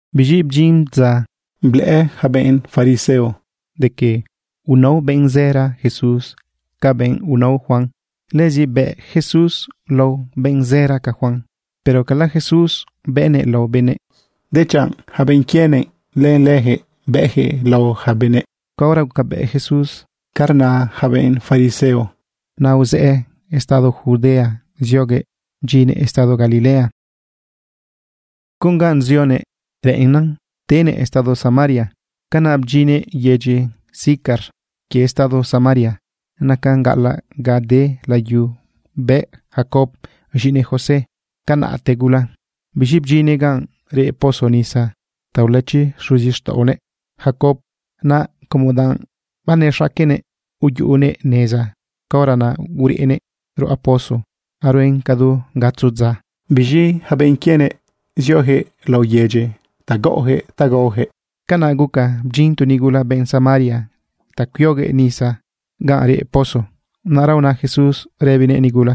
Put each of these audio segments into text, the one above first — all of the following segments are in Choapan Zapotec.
Biz̃i bdyin dza blëꞌë yaca benꞌ fariseo de que unao benꞌ zëra Jesús ca benꞌ unao Juan. Lëzi bëꞌ Jesús lao benꞌ zëra ca Juan. Pero cala Jesús bëꞌnëꞌ lao benëꞌ, dechanꞌ yaca benꞌ quienëꞌ, lëlëyaquëꞌ bëꞌyaquëꞌ lao yaca benëꞌ. Caora gucabëꞌ Jesús ca rna yaca benꞌ fariseo, naꞌ uzëꞌë estado Judea zioguëꞌ bdyinnëꞌ estado Galilea. Con ganꞌ zionëꞌ reꞌennan tenëꞌ estado Samaria. Canaꞌ bdyinnëꞌ yedyi Sicar quie estado Samaria. Nacan gaꞌalaꞌ ganꞌ de layu bëꞌ Jacob z̃iꞌinëꞌ José canaꞌte gula. Biz̃i bdyinnëꞌ ganꞌ reꞌ pozo nisa ta ulëchi xuzixtaꞌonëꞌ Jacob. Naꞌ como danꞌ banexaquenëꞌ yuꞌunëꞌ neza, caora naꞌ ureꞌnëꞌ ruꞌa pozo aruen cadu gatzo dza. Biz̃i yaca benꞌ quienëꞌ zioyaquëꞌ laꞌo yedyi ta gaꞌoyaquëꞌ ta gaoyaquëꞌ. Canaꞌ guca bdyin tu nigula benꞌ Samaria ta cuioguëꞌ nisa ganꞌ reꞌ pozo. Naꞌra una Jesús rëbinëꞌ nigula: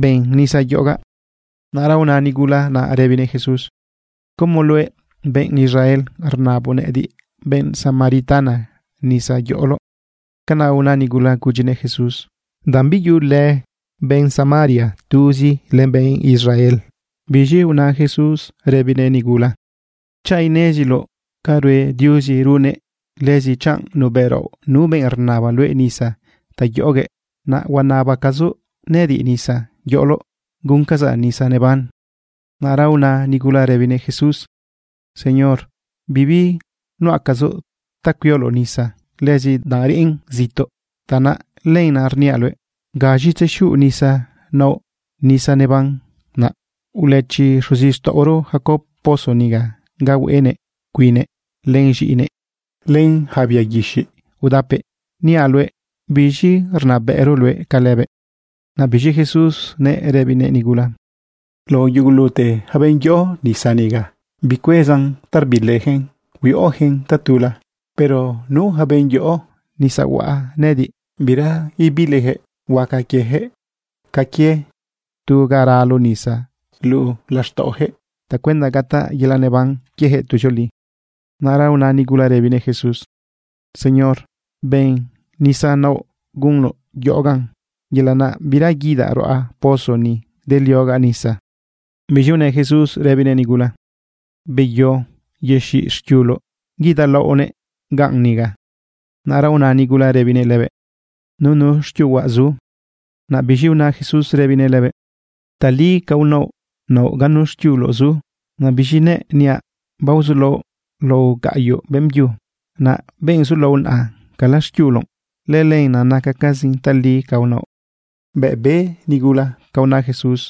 ―Ben nisa yoꞌogaꞌ. Naꞌra una nigula naꞌ rëbinëꞌ Jesús: ―¿Cómo luëꞌ, benꞌ Israel, rnaboꞌ nëꞌëdiꞌ, benꞌ Samaritana, nisa yoꞌoloꞌ? (Canaꞌ una nigula gudyinëꞌ Jesús danꞌ biyuꞌulë benꞌ Samaria tuzi len benꞌ Israel.) Biz̃i una Jesús rëbinëꞌ nigula: ―Chanꞌ ineziloꞌ ca rue run Diuzi, lëzi chanꞌ nubëꞌraoꞌ nu benꞌ rnaba luëꞌ nisa ta yoꞌoguëꞌ, naꞌ huanabacazoꞌ nëꞌëdiꞌ nisa yoꞌoloꞌ, guncazaꞌ nisa neban. Naꞌra una nigula rëbinëꞌ Jesús: ―Señor, bibi nuꞌacazoꞌ ta cuioloꞌ nisa. Lëzi danꞌ reꞌn zituꞌ, tanaꞌ lenaꞌ rniaꞌ luëꞌ ¿gaz̃i tzexiuꞌ nisa naoꞌ nisa neban naꞌ? Ulëchi xuzixtaꞌoro Jacob pozo niga ga hueꞌenëꞌ cuinnëꞌ len z̃iꞌinëꞌ len yaca bia guixiꞌ udapëꞌ. Niaꞌ luëꞌ, ¿biz̃i rnabëꞌroꞌ luëꞌ ca lëbëꞌ? Naꞌ biz̃i Jesús nëꞌ rëbinëꞌ nigula: ―Lao yugulute yaca benꞌ yoꞌo nisa niga, bicuezan ta rbiliyaquëꞌn, huiꞌoyaquëꞌn tatula. Pero nu yaca benꞌ yoꞌo nisa huaꞌ nëꞌëdiꞌ, bira ibiliyaquëꞌ. Huaca quieyaquëꞌ ca quie tu ga ralo nisa luꞌu laxtaꞌoyaquëꞌ tacuenda gataꞌ yelaꞌ neban quiejëꞌ tuzioli. Naꞌra una nigula rëbinëꞌ Jesús: ―Señor, ben nisa naoꞌ gunoꞌ yoꞌogaꞌ, yelaꞌ naꞌ bira guidaꞌ ruꞌa pozo ni ideliogaꞌ nisa. Biz̃i unë Jesús rëbinëꞌ nigula: ―Beyo yexiꞌ xquiuloꞌ guidalaoꞌnëꞌ ganꞌ niga. Naꞌra una nigula rëbinëꞌ lëbëꞌ: ―Nunu xquiuhuaꞌ zu. Naꞌ biz̃i una Jesús rëbinëꞌ lëbëꞌ: ―Tali ca unaoꞌ naoꞌ ganu xquiuloꞌ zu. Naꞌ biz̃i nëꞌ niaꞌ, baozulaoꞌ lao gaꞌyoꞌ beꞌmbyu. Naꞌ benꞌ zulaoꞌ naꞌa, cala xquiuloꞌ. Lëlënaꞌ nacacazin tali ca unaoꞌ. Bëꞌ be nigula ca una Jesús,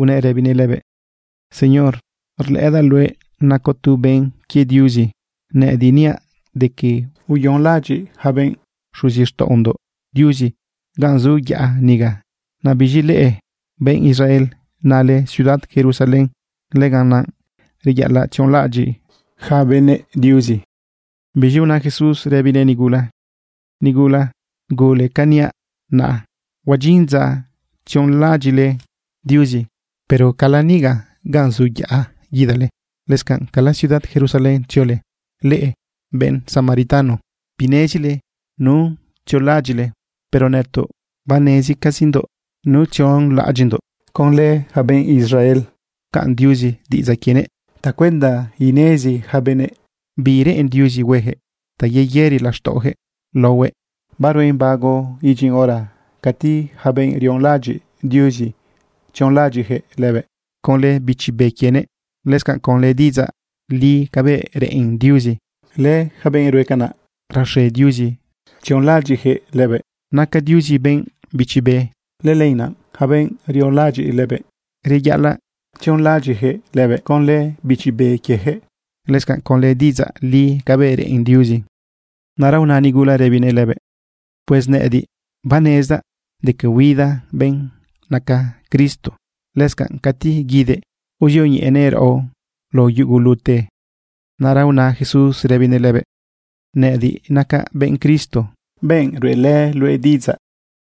unëꞌ rëbinëꞌ lëbëꞌ: ―Señor, rlëꞌëdaꞌ luëꞌ nacoꞌ tu benꞌ quie Diuzi. Nëꞌëdiꞌ niaꞌ de que uyonlaꞌadyiꞌ yaca benꞌ xuzixtaꞌondoꞌ Diuzi ganꞌ zu yaꞌa niga. Naꞌ biz̃i leꞌe, benꞌ Israel, nale ciudad Jerusalén, lëganaꞌ reyaꞌalaꞌ tzionlaꞌadyiꞌ yaca benëꞌ Diuzi. Biz̃i una Jesús rëbinëꞌ nigula: ―Nigula, gule canꞌ niaꞌ naꞌ, huadyin dza tzionlaꞌadyiꞌle Diuzi, pero cala niga ganꞌ zu yaꞌa guidale, lëscanꞌ cala ciudad Jerusalén tziole. Leꞌe benꞌ Samaritano, binezile nu tzionlaꞌadyiꞌle, pero nëtoꞌ banezcazindoꞌ nu tzionlaꞌadyiꞌndoꞌ. Conlë yaca benꞌ Israel pcaꞌn Diuzi diꞌidzaꞌ quienëꞌ tacuenda inezi yaca benëꞌ bi reꞌen Diuzi huejëꞌ ta yeyëri laxtaꞌojëꞌ laohuëꞌ. Baruen bago idyin hora cati yaca benꞌ rionlaꞌadyiꞌ Diuzi tzionlaꞌadyiꞌyaquëꞌ lëbëꞌ conlë Bichi Be quienëꞌ, lëscanꞌ conlë diꞌidzaꞌ li cabëꞌ reꞌen Diuzi. Lëyaca benꞌ rue canaꞌ, raxe Diuzi tzionlaꞌadyiꞌyaquëꞌ lëbëꞌ. Naca Diuzi benꞌ bichi be. Lëlenaꞌ yaca benꞌ rionlaꞌadyiꞌ lëbëꞌ, reyaꞌalaꞌ tzionlaꞌadyiꞌyaquëꞌ lëbëꞌ conlë bichi be quieyaquëꞌ, lëscanꞌ conlë diꞌidzaꞌ li cabëꞌ reꞌen Diuzi. Naꞌra una nigula rëbinëꞌ lëbëꞌ: ―Pues nëꞌëdiꞌ banezdaꞌ de que huida benꞌ naca Cristo. Lëscanꞌ cati guidëꞌ, uzioñeꞌenëꞌ raꞌo lao yugulute. Naꞌra una Jesús rëbinëꞌ lëbëꞌ: ―Nëꞌëdiꞌ nacaꞌ benꞌ Cristo, benꞌ ruꞌelë luëꞌ diꞌidzaꞌ.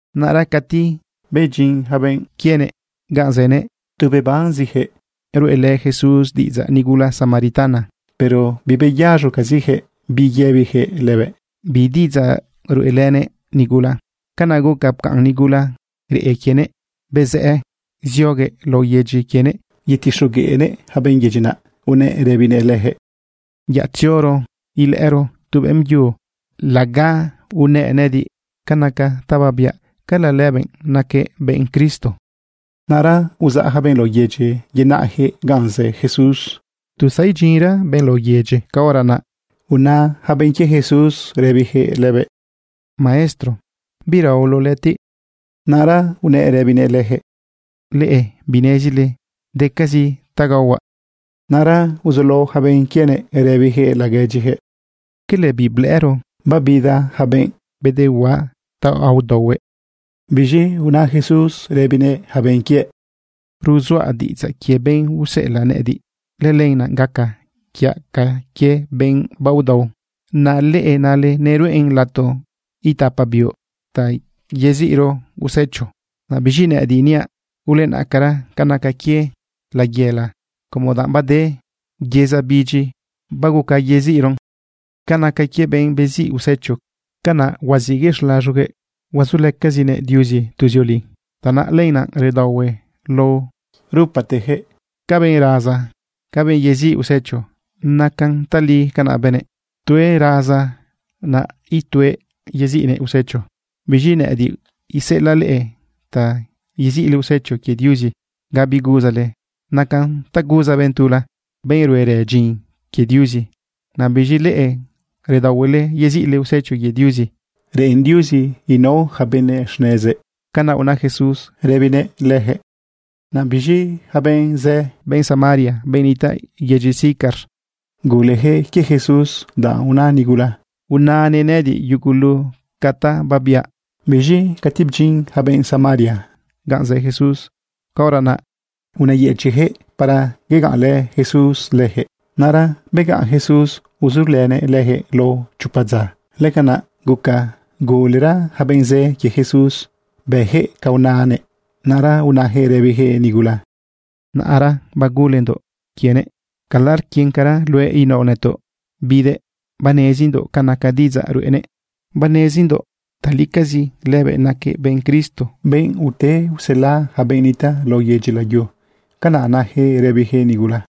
Naꞌra cati bedyin yaca benꞌ quienëꞌ ganꞌ zënëꞌ, tu bebanziyaquëꞌ ruꞌelë Jesús diꞌidzaꞌ nigula Samaritana. Pero bibeyaz̃ocaziyaquëꞌ bi yëbiyaquëꞌ lëbëꞌ bi diꞌidzaꞌ ruꞌelënëꞌ nigula. Canaꞌ guca pcaꞌn nigula reꞌe quienëꞌ, bezëꞌë zioguëꞌ laꞌo yedyi quienëꞌ yetixogueꞌnëꞌ yaca benꞌ yedyi naꞌ unëꞌ rëbinëꞌ leyaquëꞌ: ―Yaꞌ tzioro ilëꞌëro tu beꞌmbyu laga unëꞌ nëꞌëdiꞌ ca naca ta babiaꞌ. ¿Cala lëbëꞌ naquëꞌ benꞌ Cristo? Naꞌra uzaꞌ yaca benꞌ lao yedyi yenáꞌyaquëꞌ ganꞌ zë Jesús. Tu zadyinra benꞌ lao yedyi, caora naꞌ una yaca benꞌ quie Jesús rëbiyaquëꞌ lëbëꞌ: ―Maestro, ¿biraoloꞌ lëꞌëtiꞌ? Naꞌra unëꞌ rëbinëꞌ leyaquëꞌ: ―Leꞌe binezile decazi ta gaohuaꞌ. Naꞌra uzulao yaca benꞌ quienëꞌ rëbiyaquëꞌ laguedyiyaquëꞌ: ―¿Cala biblëꞌëro babida yaca benꞌ bedehuaꞌa ta udaohuëꞌ? Biz̃i una Jesús rëbinëꞌ yaca benꞌ quiëꞌ: ―Ruzuaꞌ diꞌidzaꞌ quie benꞌ useꞌelaꞌ nëꞌëdiꞌ. Lëlenaꞌ gaca quiaꞌ ca quie benꞌ baodao. ’Naꞌ leꞌe nale: “Neruꞌen lato itapa biuꞌ ta yeziꞌro usecho.” Naꞌ biz̃i nëꞌëdiꞌ niaꞌ: “Ulenaꞌcara ca naca quie layela como danꞌ bade yeza bidyi baguca yeziꞌron.” Ca naca quie benꞌ beziꞌ usecho, canaꞌ huaziꞌguëꞌ xlaz̃oguëꞌ. Huazulëcazinëꞌ Diuzi tuzioli. Tanaꞌ lenaꞌ redaohue lao rupateyaquëꞌ, ca benꞌ raza, ca benꞌ yeziꞌ usecho. Nacan tali ca na benëꞌ: “Tuëꞌ raza, naꞌ ituëꞌ yeziꞌnëꞌ usecho.” Biz̃i nëꞌëdiꞌ iseꞌelaꞌ leꞌe ta yeziꞌle usecho quie Diuzi ga biguzale. Nacan ta guza benꞌ tula, benꞌ ruerë dyin quie Diuzi. Naꞌ biz̃i leꞌe redaohuele yeziꞌle usecho quie Diuzi. Reꞌen Diuzi inao yaca benëꞌ xnezëꞌ. ―Canaꞌ una Jesús rëbinëꞌ leyaquëꞌ. Naꞌ biz̃i yaca benꞌ zë, benꞌ Samaria, benꞌ nitaꞌ yedyi Sicar, guleyaquëꞌ quie Jesús danꞌ una nigula: “Unanëꞌ nëꞌëdiꞌ yugulu ca ta babiaꞌ.” Biz̃i cati bdyin yaca benꞌ Samaria ganꞌ zë Jesús, caora naꞌ unëyëchiꞌyaquëꞌ para yegaꞌnlë Jesús leyaquëꞌ. Naꞌra begaꞌn Jesús uzulënëꞌ leyaquëꞌ lao chopa dza. Lëcanaꞌ guca gulera yaca benꞌ zë quie Jesús beyaquëꞌ ca unanëꞌ. Naꞌra unayaquëꞌ rëbiyaquëꞌ nigula: ―Naꞌra bagulendoꞌ quienëꞌ. Cala rquincara luëꞌ inaoꞌ nëtoꞌ bidëꞌ. Banezindoꞌ ca naca diꞌidzaꞌ ruꞌenëꞌ. Banezindoꞌ talicazi lëbëꞌ naquëꞌ benꞌ Cristo, benꞌ ute usela yaca benꞌ nitaꞌ lao yedyi layu. ―Canaꞌ nayaquëꞌ rëbiyaquëꞌ nigula.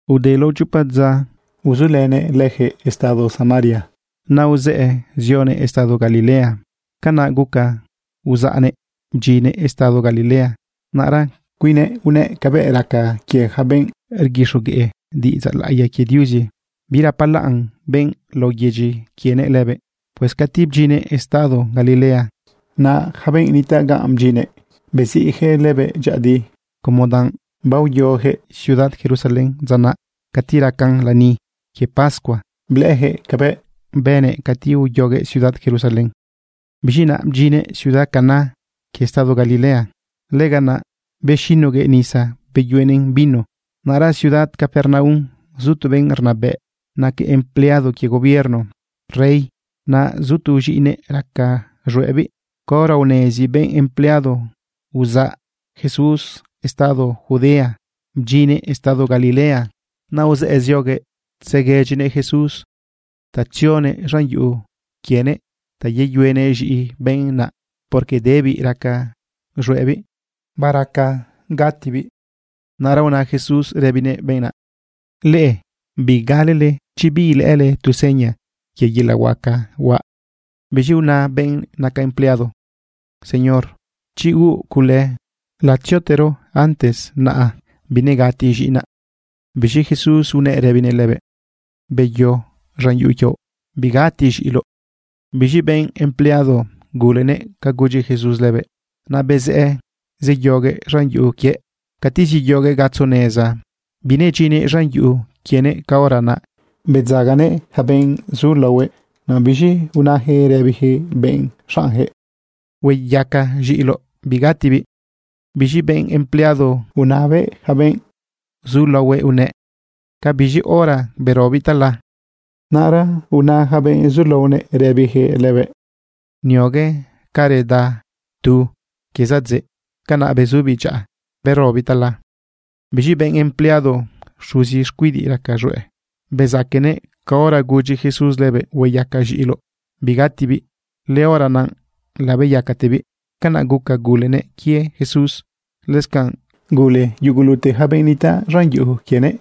Ude lao chopa dza uzulënëꞌ leyaquëꞌ estado Samaria, naꞌ uzëꞌë zionëꞌ estado Galilea. Canaꞌ guca uzaꞌnëꞌ bdyinnëꞌ estado Galilea. Naꞌra cuinnëꞌ unëꞌ cabëꞌ raca quie yaca benꞌ rguixogueꞌ diꞌidzaꞌ laꞌiya quie Diuzi. Birapalaꞌn benꞌ lao yedyi quienëꞌ lëbëꞌ. Pues cati bdyinnëꞌ estado Galilea, naꞌ yaca benꞌ nitaꞌ ganꞌ bdyinnëꞌ, beziꞌyaquëꞌ lëbëꞌ dyëꞌëdi como danꞌ baoyoyaquëꞌ ciudad Jerusalén dza naꞌ cati raca lani quie pascua, blëꞌëyaquëꞌ cabëꞌ bënëꞌ cati uyoguëꞌ ciudad Jerusalén. Biz̃i naꞌ bdyinnëꞌ ciudad Caná quie estado Galilea. Lëganaꞌ bexinoguëꞌ nisa beyuenëꞌn vino. Naꞌra ciudad Capernaum zu tu benꞌ rnabëꞌ naquëꞌ empleado quie gobierno rey. Naꞌ zu tu z̃iꞌinëꞌ raca z̃hueꞌbiꞌ. Caora unezi benꞌ empleado uzaꞌ Jesús estado Judea bdyinnëꞌ estado Galilea, naꞌ uzëꞌë zioguëꞌ tzeguedyinëꞌ Jesús ta tzionëꞌ z̃an yuꞌu quienëꞌ ta yeyuenëꞌ z̃iꞌi benꞌ naꞌ, porque debiꞌ raca z̃hueꞌbiꞌ bagatibiꞌ. Naꞌra una Jesús rëbinëꞌ benꞌ naꞌ: ―Leꞌe bigalele chi biilëꞌële tu seña quie yelaꞌ huaca huaꞌ. Biz̃i una benꞌ naca empleado: ―Señor, chi huuꞌ cule, latziotero antes naꞌa binegati z̃iꞌinaꞌ. Biz̃i Jesús unëꞌ rëbinëꞌ lëbëꞌ: ―Beyo z̃an yuꞌu quioꞌ. Bigati z̃iꞌiloꞌ. Biz̃i benꞌ empleado gulenëꞌ ca gudyi Jesús lëbëꞌ. Naꞌ bezëꞌë zeyoguëꞌ z̃an yuꞌu quiëꞌ. Cati zeyoguëꞌ gatzo neza, binedyinnëꞌ z̃an yuꞌu quienëꞌ, caora naꞌ bedzaganëꞌ yaca benꞌ zulaohuëꞌ. Naꞌ biz̃i unayaquëꞌ rëbiyaquëꞌ benꞌ xaꞌnyaquëꞌ: ―Hueyaca z̃iꞌiloꞌ, bigatibiꞌ. Biz̃i benꞌ empleado unabëꞌ yaca benꞌ zulaohuëꞌ unëꞌ: ―¿Ca biz̃i hora berobiꞌ tala? Naꞌra una yaca benꞌ zulaonëꞌ rëbiyaquëꞌ lëbëꞌ: ―Niogue ca reda tu quie zadzëꞌ, canaꞌ bezubiꞌ dyaꞌa berobiꞌ tala. Biz̃i benꞌ empleado xuzi xcuidiꞌ raca z̃hueꞌ, bezaquenëꞌ caora gudyi Jesús lëbëꞌ: “Hueyaca z̃iꞌiloꞌ bigatibiꞌ”, lëhora naꞌ labeyacatebiꞌ. Canaꞌ guca gulenëꞌ quie Jesús. Lëscanꞌ gule yugulute yaca benꞌ nitaꞌ z̃an yuꞌu quienëꞌ.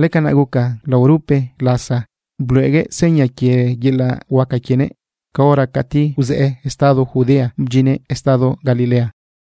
Lëcanaꞌ guca laorupe lasa bluꞌeguëꞌ seña quie yelaꞌ huaca quienëꞌ caora cati uzëꞌë estado Judea bdyinnëꞌ estado Galilea.